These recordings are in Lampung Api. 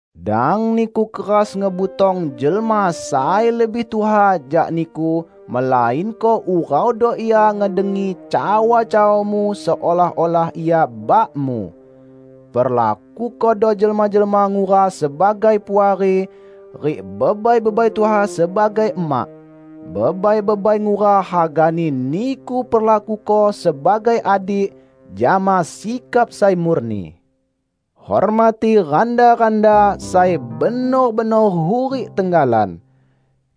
Dang niku keras ngebutong jelma sai lebih tuha jak niku melainko uraudo ia ngedengi cawa-cawamu seolah-olah ia bakmu. Perlakukodo jelma-jelma ngura sebagai puari, rik bebai-bebai tuha sebagai emak. Bebai-bebai ngura hagani niku perlakuko sebagai adik, jama sikap sai murni. Hormati randa-randa sai benor-benor hurik tenggalan.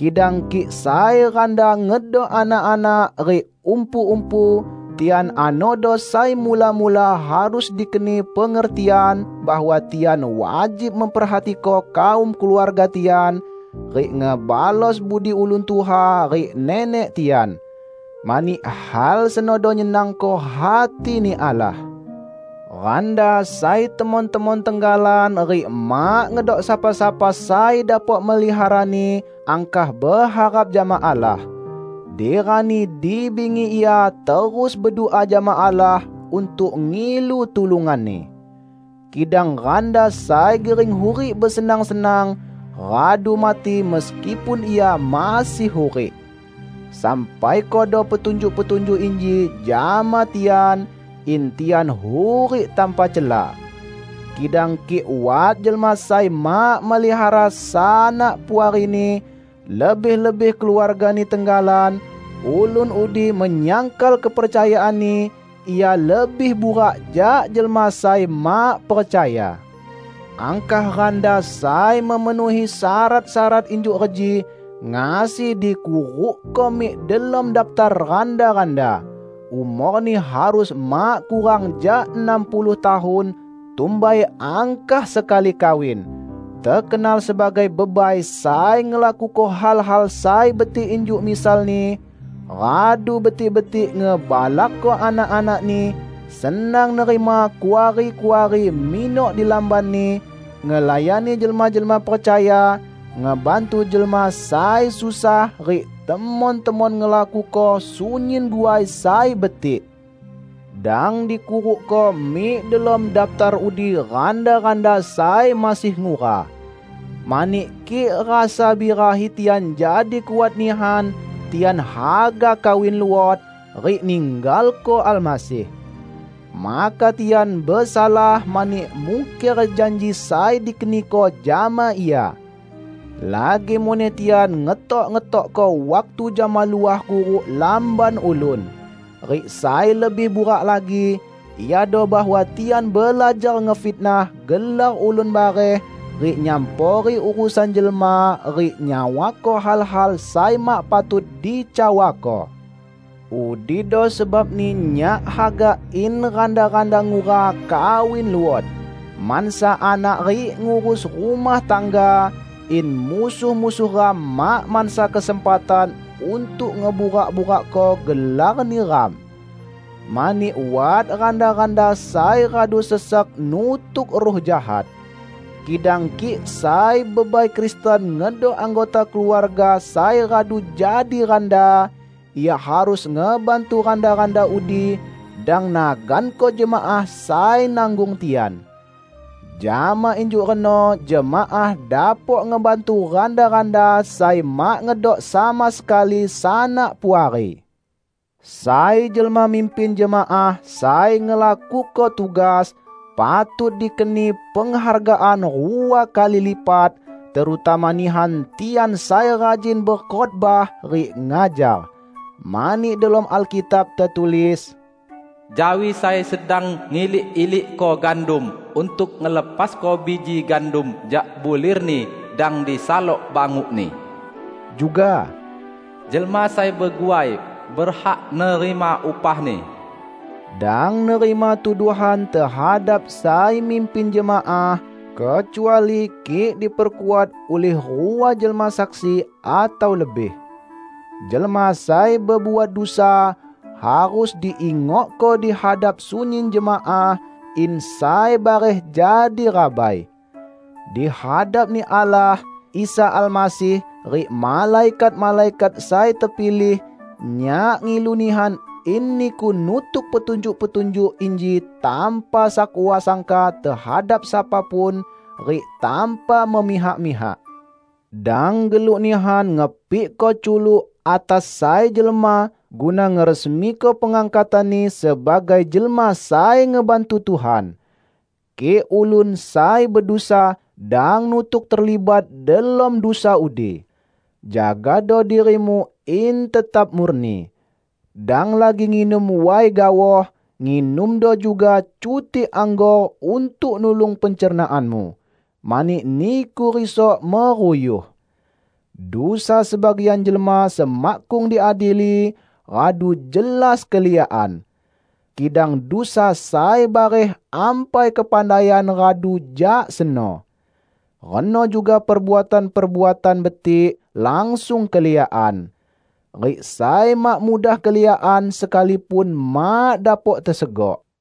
Kidang kik sai randa ngedok anak-anak rik umpu-umpu, tian anodo sai mula-mula harus dikeni pengertian bahwa tian wajib memperhatiko kaum keluarga tian, rik ngebalos budi ulun tuha rik nenek tian. Mani hal senodo nyenangko hati-Ni Allah. Randa sai temon-temon tenggalan rik mak ngedok sapa-sapa sai dapok meliharani, angkah beharap jama Allah. Di rani di bingi ia terus bedua jama Allah untuk ngilu tulungan-Ni. Kidang randa sai gering hurik besenang-senang, radu mati meskipun ia masih hurik. Sampaikodo petunjuk-petunjuk inji jama tian, in tian hurik tanpa cela. Kidang kik wat jelma sai mak melihara sanak puarini, lebih-lebih keluargani tenggalan, ulun udi menyangkal kepercayaanni; ia lebih burak jak jelma sai mak percaya. Angkah randa sai memenuhi syarat-syarat injuk reji ngasi dikurukko mik delom daptar randa-randa: umorni harus mak kurang jak enam puluh tahun, tumbai angkah sekali kawin, tekenal sebagai bebai sai ngelakuko hal-hal sai betik injuk misalni: radu betik-betik ngebalakko anak-anakni, senang nerima kuari-kuari minok di lambanni, ngelayani jelma-jelma percaya, ngebantu jelma sai susah rik temon-temon ngelakuko sunyin guai sai betik. Dang dikurukko mik delom daptar udi randa-randa sai masih ngura. Mani kik rasa birahi tian jadi kuat nihan, tian haga kawin luot; rik ninggalko Almasih. Maka tian besalah mani mungker janji sai dikeniko jama Ia. Lagi muneh tian ngetok-ngetokko waktu jama luah kuruk lamban ulun. Rik sai lebih burak lagi, iado bahwa tian belajar ngefitnah gelar ulun bareh rik nyampori urusan jelma rik nyawako hal-hal sai mak patut dicawako. Udido sebabni nyak haga in randa-randa ngura kawin luot, mansa anak rik ngurus rumah tangga, in musuh-musuh ram mak mansa kesempatan untuk ngeburak-burakko gelarni ram. Mani wat randa-randa sai radu sesek nutuk ruh jahat. Kidang kik sai bebai Kristen ngedok anggota keluarga sai radu jadi randa, ia harus ngebantu randa-randa udi; dang naganko jemaah sai nanggung tian. Jama injuk reno jemaah dapok ngebantu randa-randa sai mak ngedok sama sekali sanak puari. Sai jelma mimpin jemaah sai ngelakuko tugas, patut dikeni penghargaan rua kali lipat, terutama nihan tian sai rajin bekhotbah rik ngajar. Mani delom Alkitab tetulis, "Jawi sai sedang ngilik-ilik gandum untuk ngelepasko biji gandum jak bulirni dang disalok bangukni", juga, "Jelma sai beguai, berhak nerima upahni". Dang nerima tuduhan tehadap sai mimpin jemaah, kecuali kik diperkuat ulih rua jelma saksi atau lebih. Jelma sai bebuat dusa, harus diingokko di hadap sunyin jemaah, in sai bareh jadi rabai. Di hadap-Ni Allah, Isa Almasih, rik malaikat-malaikat sai tepilih, nyak ngilu nihan in niku nutuk petunjuk-petunjuk inji tanpa sakwa sangka tehadap sapa pun, rik tanpa memihak-mihak. Dang geluk nihan ngepikko culuk atas sai jelma guna ngeresmiko pengangkatanni sebagai jelma sai ngebantu Tuhan. Kik ulun sai bedusa, dang nutuk terlibat delom dusa udi. Jagado dirimu in tetap murni. Dang lagi nginum way gaoh; nginumdo juga cutik anggor untuk nulung pencernaanmu, mani niku risok meruyuh. Dusa sebagian jelma semakkung diadili, radu jelas keliakan. Kidang dusa sai bareh ampai kepandaian radu jak seno. Reno juga perbuatan-perbuatan betik langsung keliakan. Rik sai mak mudah keliakan sekalipun mak dapok tesegok.